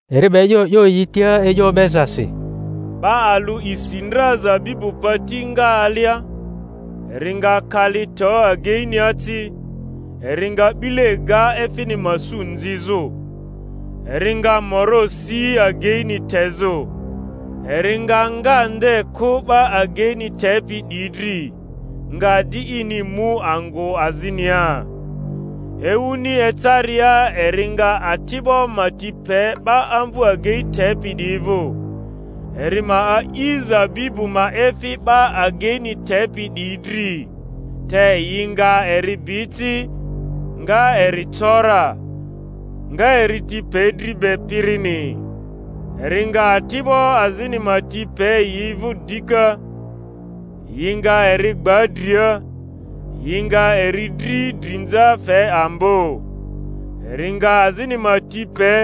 Eri 'ba e'yo 'yo yi tia e'yo o'bezasi. Ba alᴜ isi ndra zabibu pati nga alia, eri nga kali to ageinia ci, eri nga 'bile ga efini ma su nzizᴜ. eri nga moro si ageini tezᴜ; eri nga nga nde kᴜ 'ba ageini tepi 'diyi dri, nga di ini mu angᴜ azinia. Ewuni ecaria eri nga ati'bo ma ti pe 'ba amvᴜ agei tepi 'diyi vᴜ, eri ma a'i zabibu ma efi 'ba ageini tepi 'diyi dri. Te yi nga eri bi ci, nga eri co ra, nga eri ti pe dri be pirini. Eri nga ati'bo azini ma ti pe yi vᴜ dika; yi nga eri gba dria, yi nga eri dri drinza fe ambo. Eri nga azini ma ti pe,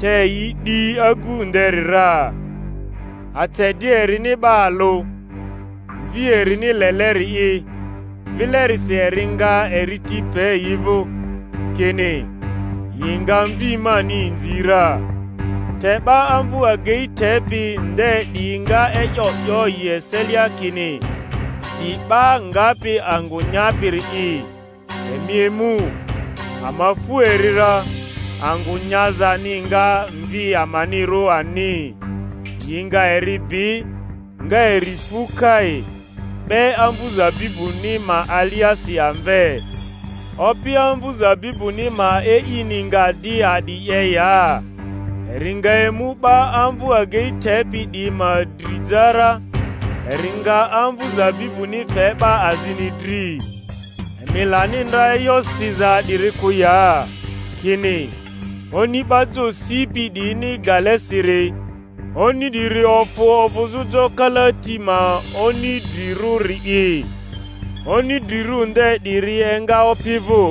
te yi 'di agu nderi ra. Ace di erini 'ba alᴜ, mvi erini leleri’i; vilerisi eri nga eri ti pe yi vᴜ, kini, Yi nga mvi mani inzi ra. Te 'ba amvu agei tepi nde 'diyi nga e'yo 'yo yi eselia kini, 'Di 'ba ngapi angᴜ nyapiri'i; emi emu, ama fu eri ra, angᴜ nyazani nga mvi amanirᴜ ani. Yi nga eri bi, nga eri fu kai, 'be amvu zabibuni ma aliasi amve. Opi amvu zabibuni ma e'ini nga di a'di 'ye ya? Eri nga emu 'ba amvu agei tepi 'diyi ma dri ja ra, eri nga amvᴜ zabibuni fe 'ba azini dri. Emi lani ndra e'yo siza 'diri kᴜ ya? kini: Oni 'ba jo sipi 'diyini gale siri, oni 'diri ofᴜ ovᴜzᴜ jo kalati ma oni drirᴜri'i; oni drirᴜ nde 'diri enga Opi vᴜ,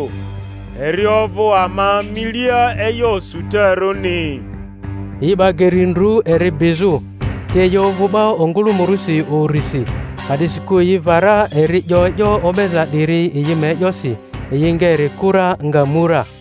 eri ovᴜ ama milia e'yo osutarᴜni. Yi 'ba geri ndru eri bizᴜ, te yi ovᴜ 'ba ongᴜlᴜmᴜrᴜsi urisi, a'disikᴜ yi va ra eri 'yo e'yo o'beza 'diri yi ma e'yosi; yi nga eri kᴜ ra, nga mu ra.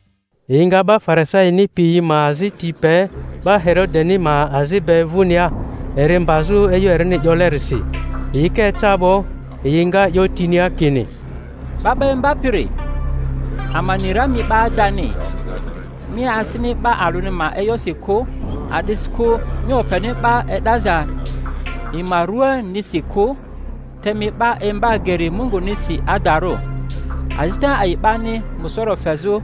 Yi nga 'ba Farisaini piyi ma azi ti pe 'ba Herodeni ma azi be vᴜnia, eri mbazᴜ e'yo erini 'yolerisi. Yi ka eca 'bo, yi nga ‘yotinia kini, Ba 'ba Imbapiri. ama ni ra mi 'ba adani, mi asini 'ba alᴜni ma e'yosi kᴜ; a'disikᴜ mi openi 'ba e'daza yi ma ruanisi kᴜ, te mi 'ba imba geri Mungunisi adarᴜ. Azita a'i 'bani musoro fezᴜ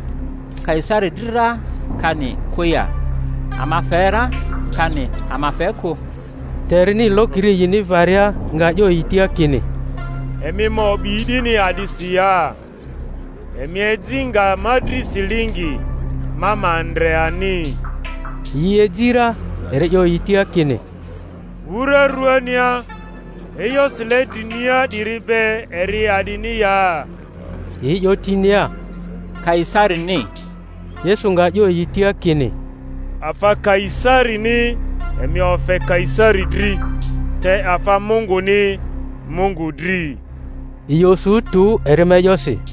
Kaisari dri ra, kani kᴜ ya? Ama fe ra, kani ama fe kᴜ? Te erini lokiri yini varia, nga 'yo yi tia kini, Emi ma o'bi 'dini a'disi ya? Emi eji nga ma dri silingi, ma ma ndre ani. Yi eji ra. Eri 'yo yi tia kini, 'wura ruania, e'yo Sile drinia 'diri be, eri a'dini ya? Yi 'yo tinia, Kaisarini. Yesu nga 'yo yi tia kini, Afa KaiSarini emi ofe Kaisari dri, te afa Munguni Mungu dri. Yi osu tᴜ eri ma e'yosi.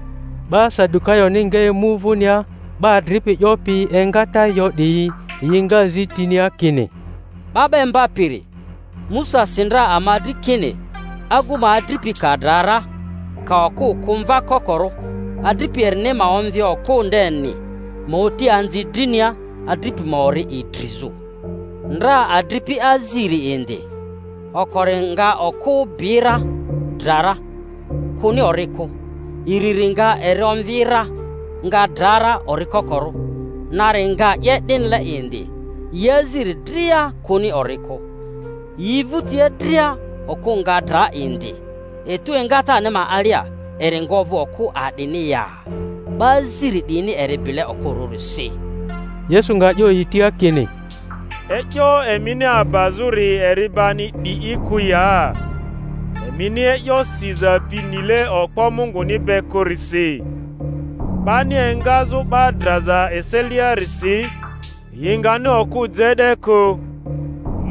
'Ba Sadukayoni nga emu vᴜnia, 'ba adripi 'yopi engata yo 'diyi; yi nga zi tinia kini, 'Ba 'ba Imbapiri, Musa si ndra ama dri kini agu ma adripi ka dra ra, ka okᴜ kᴜ mva kokorᴜ, adripi erini ma omvi okᴜ ndeni, ma oti anzi drinia adripi ma ori idrizᴜ. Ndra adripi aziri indi; okori nga okᴜ bi ra, dra ra, kᴜni ori kᴜ; iriri nga eri omvi ra, nga dra ra ori kokorᴜ; nari nga 'ye 'dinile indi; yi aziri dria kᴜni ori kᴜ. Yi vᴜtia dria okᴜ nga dra indi. Etu engatani ma alia, eri nga ovᴜ okᴜ a'dini ya? 'Ba aziri 'diyini eri bile okᴜrᴜrisi. Yesu nga 'yo yi tia kini, E'yo emini abazᴜri eri bani 'di'i kᴜ ya? emini e'yo siza pi nile okpo Munguni be kᴜrisi. 'Bani engazᴜ 'ba draza eseliarisi yi ngani okᴜ je 'de kᴜ,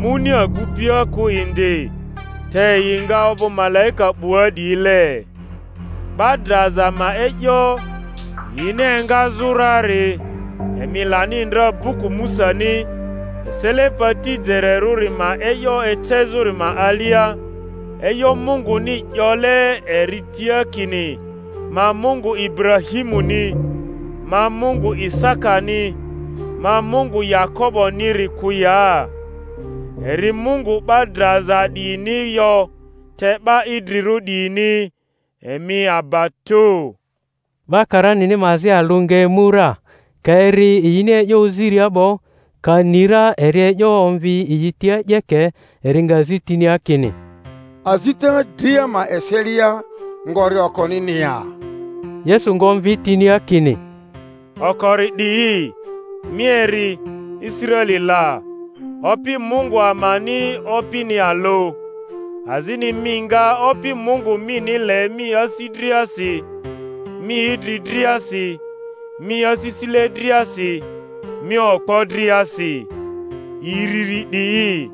muni agupia kᴜ indi, te yi nga ovᴜ malaika 'bua 'diyile. 'Ba draza ma e'yo, yini engazᴜ rari, emi lani ndra buku Musani, esele pati jererᴜri ma e'yo ecezᴜri ma alia, e'yo Munguni 'yole eri tia kini, Ma Mungu Iburahimuni, ma Mungu Isakani, ma Mungu Yakoboni-ri kᴜ ya? Eri Mungu 'ba draza 'diyini yo, te 'ba idrirᴜ 'diyini; emi aba tᴜ. 'Ba karanini ma azi alᴜ nga emu ra, ka eri yini e'yo oziria 'bo, ka ni ra eri e'yo omvi yi tia 'yeke, eri nga zi tinia kini, Azita dria ma eselia, ngori okonini ya? Yesu nga omvi tinia kini, Okori 'di'i, Mi eri, Israeli la: Opi Mungu amani, Opini alᴜ; azini mi nga Opi Mungu mini le mi asi driasi, mi idri driasi, mi asisile driasi, mi okpo driasi. Iriri 'di'i,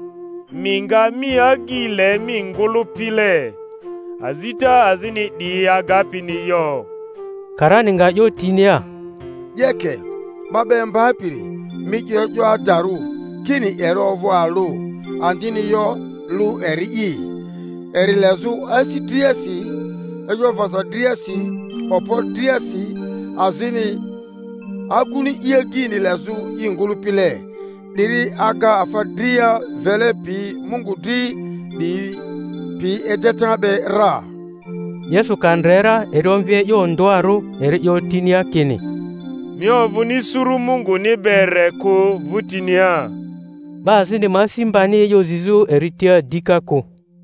Mi nga mi agyi le mi ngᴜlᴜpile. Azita azini 'diyi agapini yo. Karani nga 'yo tinia, Yeke, 'Ba 'ba Imbapiri; mi 'yo e'yo adarᴜ kini eri ovᴜ alᴜ, andini yo lᴜ eri'i; eri lezᴜ asi driasi, e'yo vaza driasi, okpo driasi, azini aguni i agyi lezᴜ i ngᴜlᴜpile, 'diri aga afa dria vele pi Mungu dri 'diyi pi edeta be ra. Yesu ka ndre ra eri omvi e'yo ondᴜarᴜ, eri 'yo tinia kini, Mi ovᴜni suru Munguni be re kᴜ 'vᴜtinia 'ba azini ma asi mbani e'yo zizᴜ eri tia dika kᴜ.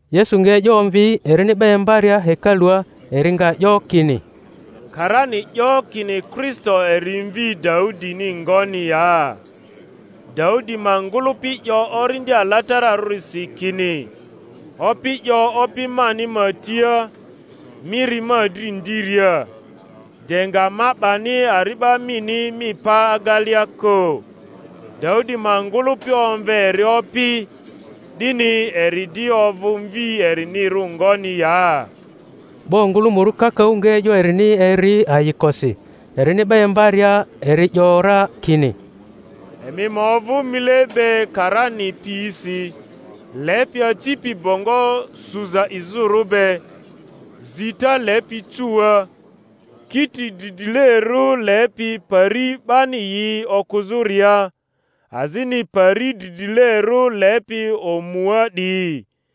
Yesu nga e'yo omvi, erini 'ba imbaria hekalua, eri nga 'yo kini, Karani 'yo kini Kristo eri mvi Daudini ngoni ya? Daudi ma ngᴜlᴜpi 'yo Orindi Alatararᴜsi, kini, Opi 'yo Opi mani ma tia, Mi ri ma dri ndiria, de nga ma 'bani ari'ba mini mi pa agelea kᴜ. Daudi ma ngᴜlᴜpi omve eri Opi, 'dini; eri di ovᴜ mvi erinirᴜ ngoni ya? Ba ongᴜlᴜmᴜrᴜ kakaᴜ nga e'yo erini eri ayikosi. Erini 'ba imbaria, eri 'yo ra kini, Emi ma ovᴜ mile be karani piyisi, lepi acipi bongo suza izᴜrᴜ be, zita lepi cuua, kiti dridrilerᴜ lepi pari 'bani yi okᴜzᴜria, azini pari dridrilerᴜ lepi omua 'diyi;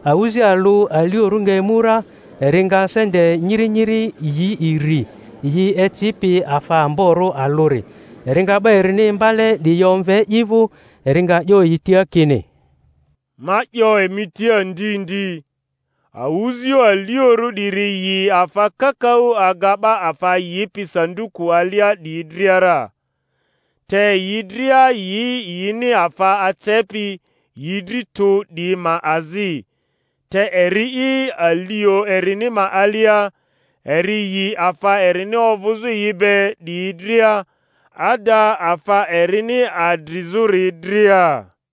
Awᴜzi alᴜ aliorᴜ nga emu ra, eri nga sente nyiri nyiri yi iri, yi ecipi afa amborᴜ alᴜri. Eri nga 'ba erini imbale 'diyi omve i vᴜ, eri nga 'yo yi tia kini, Ma 'yo emi tia ndi ndi, awᴜzio aliorᴜ 'diri yi afa kakaᴜ aga ‘ba afa yipi sanduku alia 'diyi dria ra. Te yi dria yi yini afa acepi yi dri tᴜ 'diyi ma azi, te eri'i, alio erini ma alia, eri yi afa erini ovᴜzᴜ yi be 'diyi dria, ada afa erini adrizᴜri dria.